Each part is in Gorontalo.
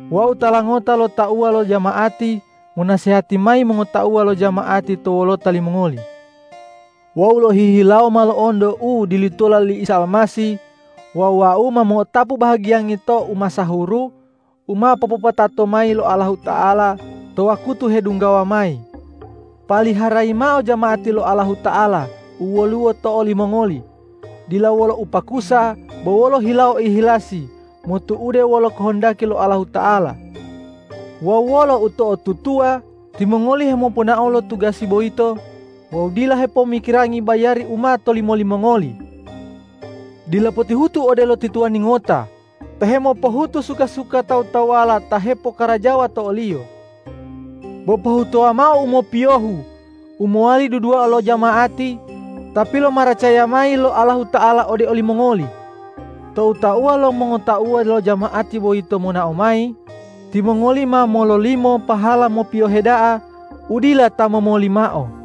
Wau tala ngota lo tauwa lo jama'ati monasehati mayi mongotauwa lo jama'ati to wolota limongoli. Wau lohihilawo ma lo'onto u dilutola li Isa Almasih wawu wau ma mo'otapu bahagiyangi to umasahuru u ma popopatato mayi lo Allahuta'ala to wakutu hedunggawa mayi. Paliharayi mao jama'ati lo Allahuta'ala u woluwo to olimongoli, dila wolo upakusa, bo wolo hilawo ihilasi motu'ude wolo kohondaki lo Allahuta'ala. Wawu wolo uto'otutuwa timongoli hemoponao lo tugasi boyito wawu dila hepomikirangi bayari u ma tolimo limongoli. Dila potihutu odelo ti tuwani ngota ta hemopohutu suka-suka tawu-tawuwala ta hepokarajawa to oliyo. Bo pohutuwa mao u mopiyohu u mowali dudua lo jama'ati ta pilomaracaya mayi lo Allahuta'ala ode olimongoli. Tou tauwa lo mongotauwa lo jama'ati boyito ma monao mayi, timongoli ma mololimo pahala mopiyohe da'a u dila ta momoli mao.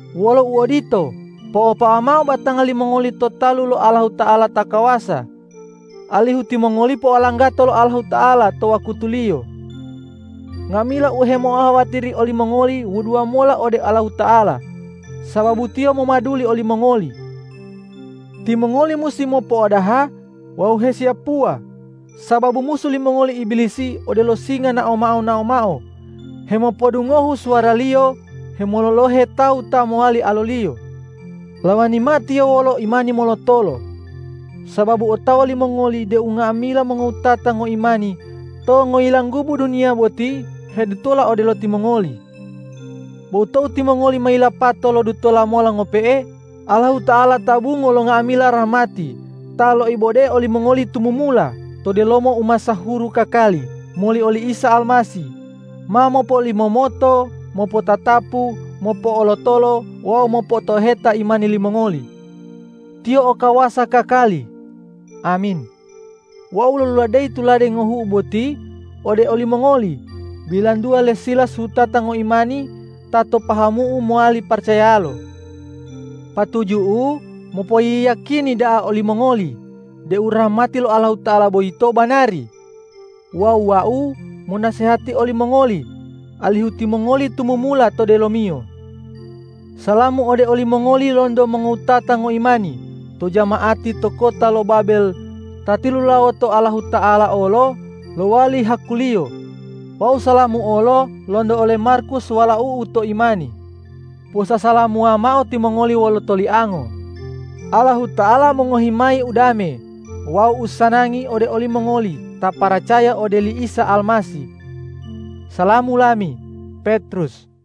Wolo uodito, po'opawa mao batanga limongoli to talu lo Allahuta'ala ta kawasa, alihu timongoli po'olanggato lo Allahuta'ala to wakutuliyo. Nga'amila u hemo'ohawatiri olimongoli wuduwa mola ode Allahuta'ala, sababu Tiyo momaduli olimongoli. Timongoli musi mopo'odaha wawu hesiyapuwa, sababu musu limongoli Ibilisi odelo singa naomao-naomao hemopodungohu suwaraliyo hemololohe tawu ta mowali aloliyo. Lawani mao tiyo wolo imani molotolo, sababu otawa limongoli deu nga'amila mongowutata ngoimani to ngoyilanggubu duniya boti hedutola odelo timongoli. Bo tou timongoli ma yilapato lodutola mola ngope'e, Allahuta'ala ta bungo lo nga'amila rahmati ta loibode olimongoli tumumula to delomo umasahuru kakali moli oli Isa Almasih, ma mopolimomoto, mopotatapu, mopo'olotolo wawu mopo'otoheta imani limongoli. Tiyo o kawasa kakali. Amin. Wau loluladeyi tulade ngohu'u boti ode olimongoli bilantuwa le Silas wutata ngoimani ta to pahamu'u mowali paracayalo. Patuju'u mopoyiyakini da'a olimongoli deu rahmati lo Allahuta'ala boyito banari wawu wau monasehati olimongoli alihu timongoli tumumula to delomiyo. Salamu ode olimongoli lonto mongowutata ngoimani to jama'ati to kota lo Babel ta tilulawoto Allahuta'ala olo lowali haku-Liyo wawu salamu olo lonto ole Markus walau'u to imani. Posasalamuwa mao timongoli wolo toliango. Allahuta'ala mongohi mayi udame wawu usanangi ode olimongoli ta paracaya ode oli Isa Almasih. Salamu lami, Petrus